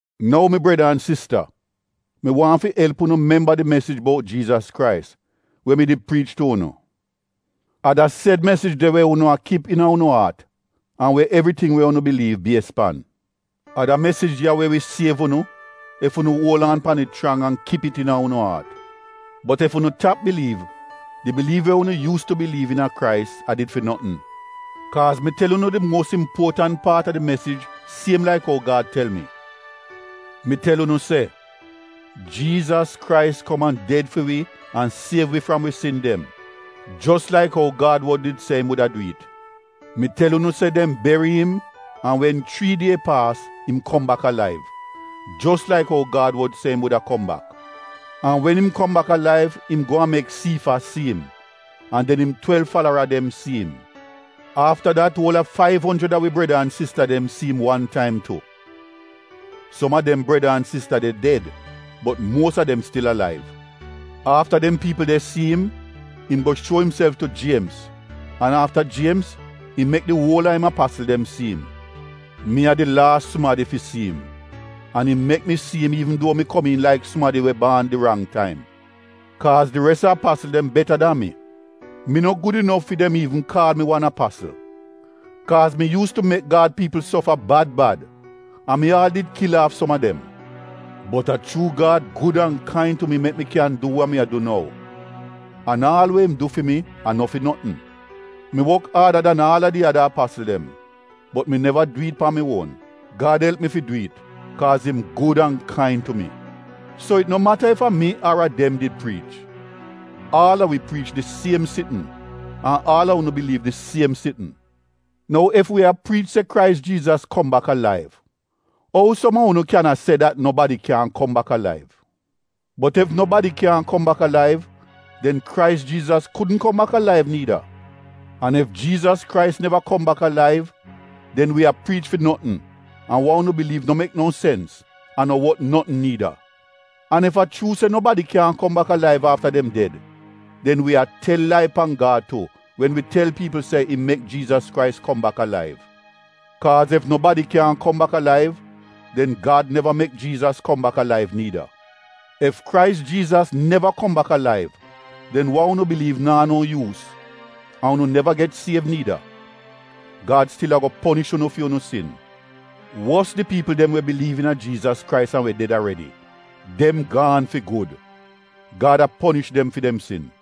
Nou mi breda an sista mi waahn fi elp unu memba di mesij bout Jiizas Krais we mi did priich tu unu. A da sed mesij de we unu a kip iina unu aat an we evriting we unu biliiv bies pan. A da mesij ya we wi siev unu ef unu uol an pan it chrang an kip it iina unu aat. Bot ef unu tap biliiv, di biliiv we unu yuus tu biliiv iina Krais a did fi notn. Kaaz mi tel unu di muos impuotant paat a di mesij siem laik ou Gad tel mi. Mi tel unu se Jiizas Krais kom an ded fi wi an siev wi fram wi sin dem jos laik ou Gad wod did se im wuda du it Mi tel unu se dem beri im an wen chrii die paas im kom bak alaiv, jos laik ou Gad wod se im wuda kom bak. An wen im kom bak alaiv im go an mek Siifas si im an den im twelv falara dem si im. Afta dat uol a faiv onjrid a wi breda an sista dem si im wan taim tu. Som a dem breda an sista de ded bot muos a dem stil alaiv. Afta dem piipl de si im, im go shuo imself tu Jiemz an afta Jiemz im mek di uol a im apasl dem si im. Mi a di laas sumadi fi si im an im mek mi si im iivn duo mi komiin laik sumadi we baan di rang taim. Kaaz di res a apasl dem beta dan mi. Mi no gud inof fi dem iivn kaal mi wan apasl kaaz mi yuus tu mek Gad piipl sofa bad bad an mi aal did kil aaf som a dem. Bot a chuu Gad gud an kain tu mi mek mi kyan du wa mi a du nou, an aal we im du fi mi, a no fi notn. Mi wok aada dan aal a di ada apasl dem. Bot mi neva du it pan mi uon, Gad elp mi fi du it, kaaz im gud an kain tu mi. So it no mata ef a mi ar a dem did priich. Aal a wi priich di siem sitn an aal a unu biliiv di siem sitn. Nou ef wi a priich se Krais Jiizas kom bak alaiv, ou som a unu kyan a se dat nobadi kyaahn kom bak alaiv? Bot ef nobadi kyaahn kom bak alaiv, den Krais Jiizas kudn kom bak alaiv niida. An ef Jiizas Krais neva kom bak alaiv, den wi a priich fi notn an wa unu biliiv no mek no sens an no wot notn niida. An ef a chuu se nobadi kyaahn kom bak alaiv afta dem ded den wi a tel lai pan Gad tu wen wi tel piipl se im mek Jiizas Krais kom bak alaiv. Kaaz ef nobadi kyaahn kom bak alaiv, den Gad neva mek Jiizas kom bak alaiv niida. Ef Krais Jiizas neva kom bak alaiv den wa unu biliiv naa no yuus, an unu neva get siev niida. Gad stil ago ponish unu fi unu sin. Wos di piipl dem we biliiv iina Jiizas Krais an we ded aredi, dem gaan fi gud — Gad a ponish dem fi dem sin.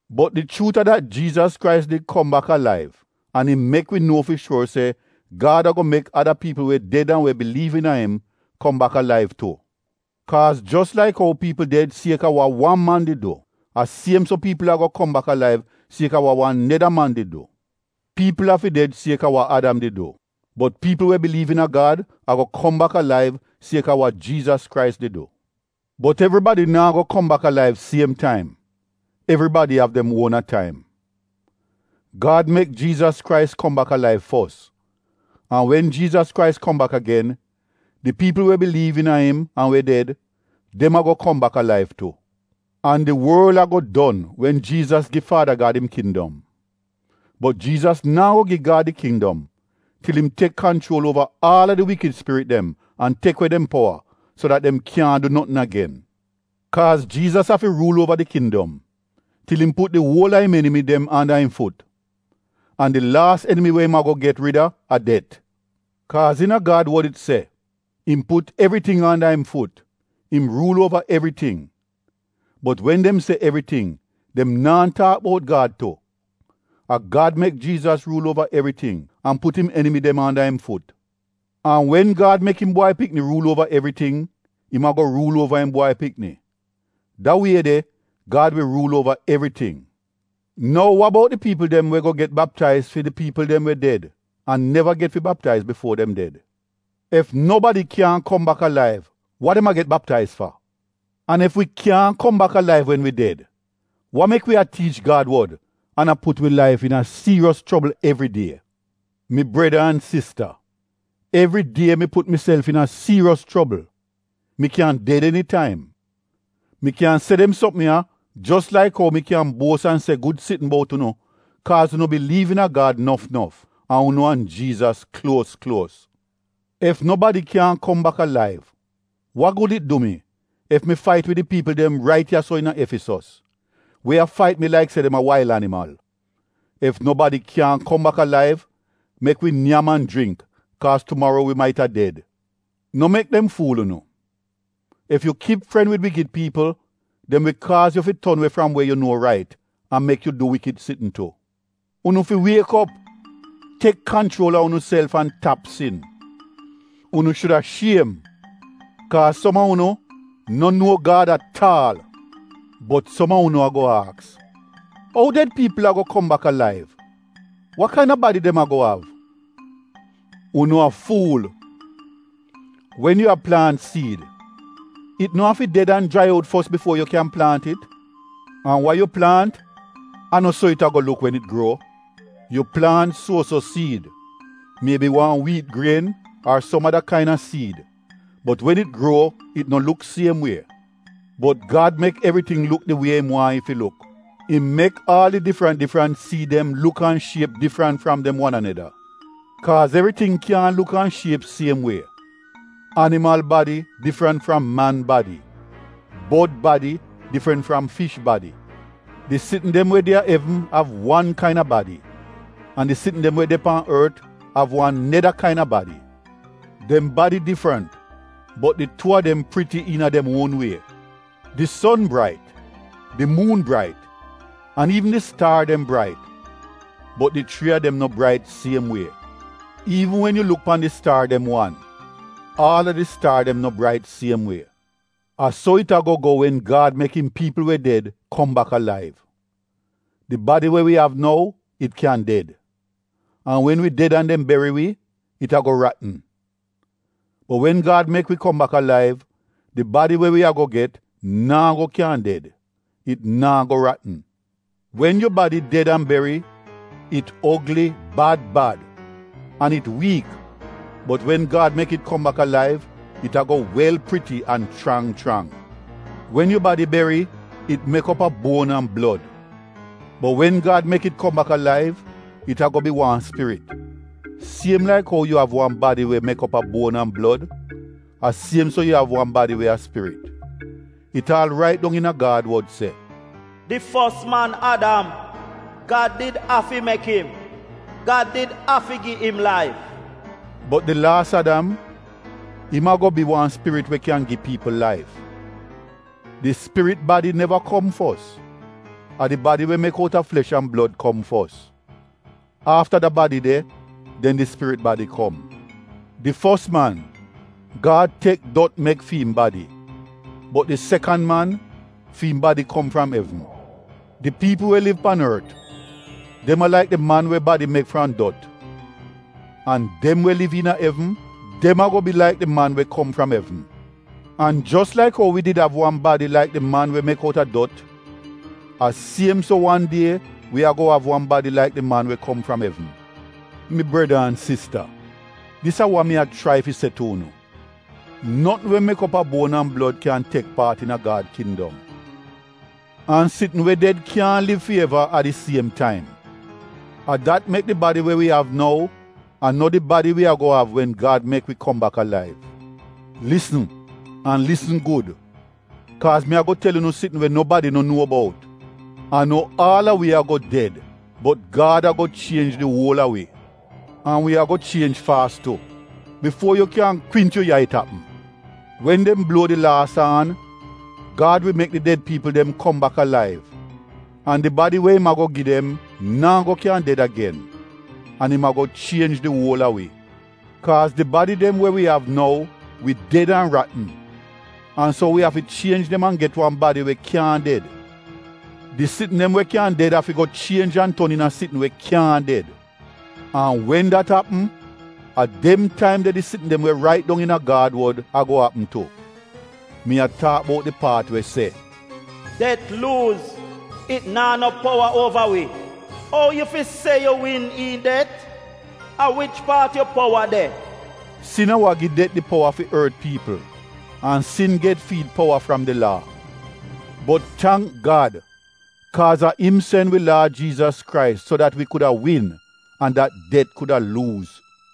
Bot di chuut a dat Jiizas Krais did kom bak alaiv. An im mek wi nuo fi shuor se Gad ago mek ada piipl we ded an we biliiv iina im kom bak alaiv tu. Kaaz jos laik ou piipl ded kaaz a wa wan man did du a siem so piipl ago kom bak alaiv kaaz a wa wan neda man did du. Piipl afi ded sieka wa Adam did du, bot piipl we biliiv iina Gad ago kom bak alaiv kaaz a wa Jiizas Krais did du. Bot evribadi naa go kom bak alaiv siem taim, evribadi av dem uona taim. Gad mek Jiizas Krais kom bak alaiv fos, an wen Jiizas Krais kom bak agen, di piipl we biliiv iina im an we ded, dem ago kom bak alaiv tu. An di worl ago don wen Jiizas gi Faada Gad im kindom. Bot Jiizas naa go gi Gad di kindom til im tek kanchuol uova aal a di wikid spirit dem an tek we dem powa so dat dem kyaahn du notn agen. Kaaz Jiizas afi ruul uova di kindom, til im put di uol a im enimi dem anda im fut. An di laas enimi we im ago get rida a det. Kaaz iina Gad wod it se, “Im put evriting anda im fut — im ruul uova evriting.” Bot wen dem se “evriting,” dem naa taak bout Gad tu. A Gad mek Jiizas ruul uova evriting an put im enimi dem anda im fut. An wen Gad mek im Bwai Pikni ruul uova evriting, im ago ruul uova im Bwai Pikni, da wie de Gad wi ruul uova evriting. Nou, wa bout di piipl dem we go get baptaiz fi di piipl dem we ded an neva get fi baptaiz bifuo dem ded? Ef nobadi kyaahn kom bak alaiv wa dem a get baptaiz fa? An ef wi kyaahn kom bak alaiv wen wi ded, mek wi a tiich Gad wod an a put wi laif iina dienja evridie? Mi breda an sista, evridie mi put miself iina dienja — mi kyan ded enitaim. Mi kyan se dem sopm ya jos laik ou mi kyan buos an se gud sitn bout unu kaaz unu biliiv iina Gad nof nof an unu an Jiizas kluos kluos. Ef nobadi kyaahn kom bak alaiv, wa gud it du mi ef mi fait wid di piipl dem rait ya-so iina Efisos, we a fait mi laik se dem a wail animal? Ef nobadi kyaahn kom bak alaiv, “Mek wi nyam an jringk, kaaz tumaro wi maita ded.” No mek dem fuul unu, “Ef yu kip fren wid wikid piipl, dem wi kaaz yu fi ton we fram we yu nuo rait, an mek yu du wikid sitn tu.” Unu fi wiek op, tek kanchuol a unuself an tap sin. Unu shuda shiem kaaz som a unu no nuo Gad at aal. Bot som a unu ago aks, “Ou ded piipl ago kom bak alaiv? Wa kaina badi dem ago av?” Unu a fuul! Wen yu a plaant siid, it no afi ded an jrai out fos bifuo yu kyan plaant it. An wa yu plaant a no so it ago luk wen it gruo. Yu plaant suo-so siid, miebi wan wiit grien ar som ada kaina siid, bot wen it gruo it no luk siem wie. Bot Gad mek evriting luk di wie im waahn it fi luk. Im mek aal di difrant difrant siid dem luk an shiep difrant fram dem wan aneda. Kaaz evriting kyaahn luk an shiep siem wie — animal badi difrant fram man badi, bod badi difrant fram fish badi. Di sitn dem we de a evn av wan kaina badi an di sitn dem we de pan ort av wan neda kaina badi. Dem badi difrant bot di tuu a dem priti iina dem uon wie. Di son brait, di muun brait an iivn di staar dem brait, bot di chrii a dem no brait siem wie. Iivn wen yu luk pan di staar dem wan, aal a di staar dem no brait siem wie. A so it ago go wen Gad mek im piipl we ded kom bak alaiv. Di badi wa wi av nou, it kyan ded. An wen wi ded an dem beri wi, it ago ratn. Bot wen Gad mek wi kom bak alaiv, di badi we wi ago get, naa go kyan ded — it naa go ratn. Wen yu badi ded an beri, it ogli bad bad an it wiik bot wen Gad mek it kom bak alaiv it ago wel priti an chrang chrang. Wen yu badi beri, it mek op a buon an blod, bot wen Gad mek it kom bak alaiv, it ago bi wan spirit. Siem laik ou yu av wan badi we mek op a buon an blod, a siem so yu av wan badi we a spirit. It aal rait dong iina Gad wod se, “Di fos man, Adam, Gad did afi mek im — Gad did afi gi im laif.” Bot di laas Adam, im ago bi wan spirit we kyan gi piipl laif. Di spirit badi neva kom fos, a di badi we mek out a flesh an blod kom fos. Afta da badi de, den di spirit badi kom. Di fos man, Gad tek dot mek fi im badi, bot di sekan man, fi im badi kom fram evn. Di piipl we liv pan ort, dem a laik di man we badi mek fram dot. An dem we liv iina evn, dem ago bi laik di man we kom fram evn. An jos laik ou wi did av wan badi laik di man we mek out a dot, a siem so wan die wi ago av wan badi laik di man we kom fram evn. Mi breda an sista, dis a wa mi a chrai fi se tu unu, notn we mek op a buon an blod kyan tek paat iina Gad kindom. An sitn we ded kyaahn liv fi eva a di siem taim, a dat mek di badi we wi av nou a no di badi wi ago av wen Gad mek wi kom bak alaiv. Lisn an lisn gud kaaz mi ago tel unu sitn we nobadi no nuo bout — a no aal a wi ago ded bot Gad ago chienj di uol a wi. An wi ago chienj faas tu, bifuo yu kyan kwint yu yai it apm. Wen dem bluo di laas aan, Gad wi mek di ded piipl dem kom bak alaiv an di badi we im ago gi dem naa go kyan ded agen. An im ago chienj di uol a wi. Kaaz di badi dem we wi av nou wi ded an ratn an so wi afi chienj dem an get wan badi we kyaahn ded. Di sitn dem we kyan ded afi go chienj an ton iina sitn we kyaahn ded. An wen dat apm, a dem taim de di sitn dem we rait dong iina Gad wod ago apm tu. Mi a taak bout di paat we se, “Det luuz, it naa no powa uova wi.” “Ou yu fi se yu win iihn det? A wich paat yu powa de?” Sin a wa gi det di powa fi ort piipl an sin get fi it powa fram di laa. Bot tangk Gad kaaz a im sen wi Laad Jiizas Krais so dat wi kuda win an dat det kuda luuz.